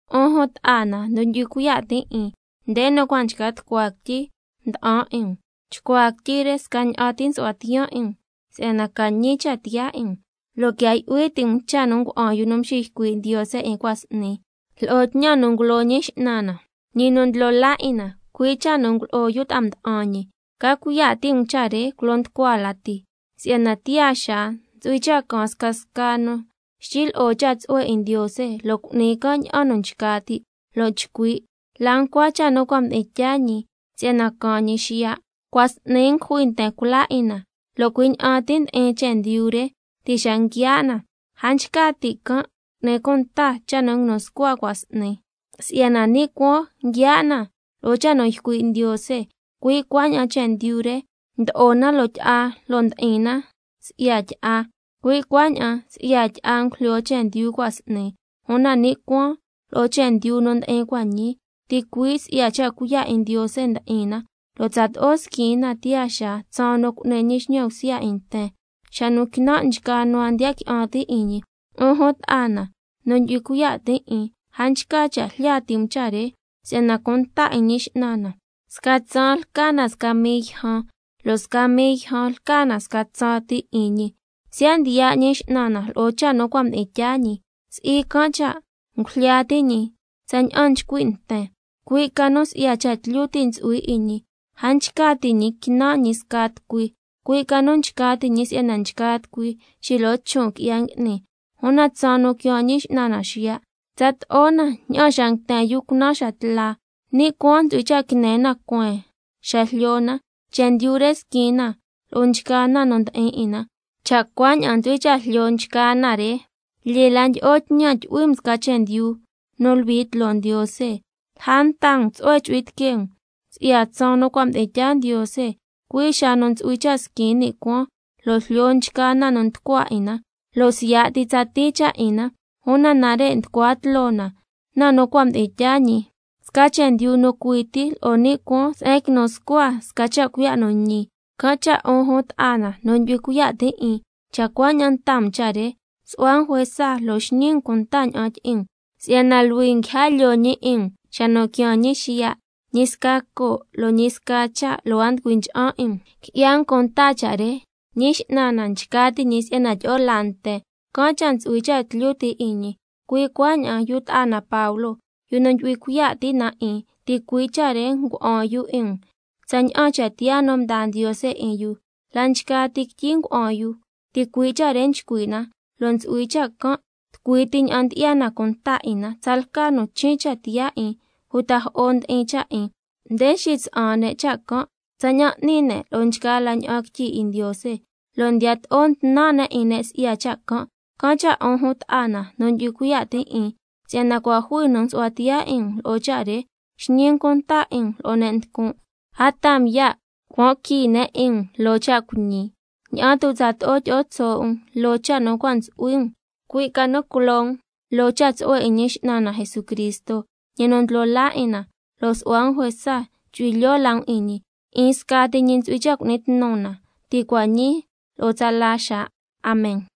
'Un jun ta'a na nu ndyu'hui cuiya' tin' 'in, nde nu cua' nchca tucua quityi nda'an 'in um, chcuaa quityi re scaña'an ti nsu'hua tiyaan 'in um si'yana ca ñi cha' tiyaa 'in um, lo' quia yu'hui ti' um cha' nu ngua'an yu nu mxiycui' Ndiose 'in cua' s'ni, lo'o tñan nu ngulo Ñi X'nan na, ñi nu Ndlo laa 'in na, cui' cha' nu ngulo'o yu ta'a mda'an ñi. Ca cuiya' ti' um cha' re culo nducua lati, si'yana tiyaa xaa ntsu'hui cha' caan scasca nu xtyi lyi'o cha' tsu'hue 'in Ndiose, lo' cu'ni can' ña'an nu nchca ti', lo' ndeña'an chcui': ¿La ncua cha' nu cua' mdi'in tyaa ñi si'yana caan ñi xiya'? Cua' s'ni ngujui nten cula 'in na, lo' cui' ña'an ti ndi'in chendyu re ti' xa nguiaa' na. A nchca ti' can' cu'ni cunta cha' nu nguinu scua cua' s'ni, si'yana ni' cuaan nguiaa' na lo'o cha' nu ycui' Ndiose, cui' cuaña'an chendyu re mdo'o na loo tyi'a lo' ndi'in na si'ya tyi'a, cui' cuaña'an si'ya tyi'a ngujlyo chendyu cua' s'ni. Una ni' cuaan lo'o chendyu nu ndi'in cua' ñii, ticui' si'ya cha' cuiya' 'in Ndiose ndi'in na, lo' tsato'o squin na tiyaa xaa tsaan nu cu'ni ñi xñan bsya 'in nten, xa nu quinan' nchgaa nu a ndiya qui'an ti' 'in ñi. 'Un jun ta'a na nu ndyu'hui cuiya' tin' 'in, a nchca cha' jlya ti' um cha' re, si'yana cunta 'in Ñi X'nan na sca tsaan lca na sca mii yjan, lo' sca mii yjan lca na sca tsaan ti 'in ñi. Siya' ndiya' Ñi X'nan na lo'o cha' nu cua' mdi'in tyaa ñi, si'i can' cha' ngujlya ti' ñi tsaña'an nchcui' nten, cui' ca nu si'ya cha' tlyu ti' ntsu'hui 'in ñi a nchca ti' ñi quinan' ñi sca tucui, cui' ca nu nchca ti' ñi si'yana nchgaa tucui xilo'o chon' qui'ya ngui'ni. Una tsaan nu quiaan Ñi X'nan na xiya', tsato'o na ña'an xa nguiten yu cunan xa tla, ni' cuaan ntsu'hui cha' quine na cueen xa jlyo na, chendyu re squin na lo'o nchgaa na nu ndi'in 'in na. Cha' cuaña'an ntsu'hui cha' jlyo nchgaa na re, lyee la ndyi'o tñan tyu'hui um sca chendyu nu luhui tloo Ndiose, lja nta um tsu'hue ntsu'hui tiquee um si'ya tsaan nu cua' mdi'in tyaa Ndiose, cui' xa nu ntsu'hui cha' squin ni' cuaan lo' jlyo nchgaa na nu nducua 'in na, lo' siya' ti tsatii cha' 'in na. Una nare' nducua tloo na cha' nu cua' mdi'in tyaa ñi, sca chendyu nu cui ti lo'o ni' cuaan se'en quinu scua sca cha' cuiya' nu ñi. Can' cha' 'un jun ta'a na nu ndyu'hui cuiya' tin' 'in, cha' cuaña'an nta um cha' re, su'hua um juesa lo' xñi um cunta ña'an tyi'in um, si'yana luhui um quija lyoo ñi 'in um xa nu quiaan ñi xiya', ñi sca coo' lo' ñi sca cha' lo' a nducui ncha'an 'in um. Qui'ya um cunta cha' re: Ñi X'nan na nchca ti' ñi si'yana tyi'o laa nten, can' cha' ntsu'hui cha' tlyu ti' 'in ñi. Cui' cuaña'an yu ta'a na Pablo, yu nu ndyu'hui cuiya' ti' na 'in, ticui' cha' re ngua'an yu 'in um tsaña'an cha' tiyaa nu mdaa Ndiose 'in yu, la' nchgaa ti quityi ngua'an yu ticui' cha' re nchcui' na, lo' ntsu'hui cha' can' tucui ti ña'an ndyi'ya na cunta 'in na. Tsalca nu chin' cha' tiyaa 'in uta jo'o ndi'in cha' 'in, nde xitsa'an ne' cha' can' tsaña'an n'ni ne' lo'o nchgaa la ña'an quityi 'in Ndiose, lo' ndiyato'o ntnan' ne' 'in ne' si'ya cha' can'. Can' cha' 'un jun ta'a na nu ndyu'hui cuiya' tin' 'in, si'yana cua' jui nu msu'hua tiyaa 'in um lo'o cha' re, xñi um cunta 'in um lo'o ne' nducun', a taa um ya' cuan qui ne' 'in um loo cha' cuiñi, ña'an tu' tsato'o tyi'o tso' um loo cha' nu cua' ntsu'hui um. Cui' ca nu culo um loo cha' tsu'hue 'in Ñi X'nan na Jesucristo, ñi nu Ndlo laa 'in na, lo' su'hua um juesa chu'hui lyoo la um 'in ñi. 'In scati ñi ntsu'hui cha' cu'ni tnu na, ti' cua' ñii lo' tsala xaa. Amen.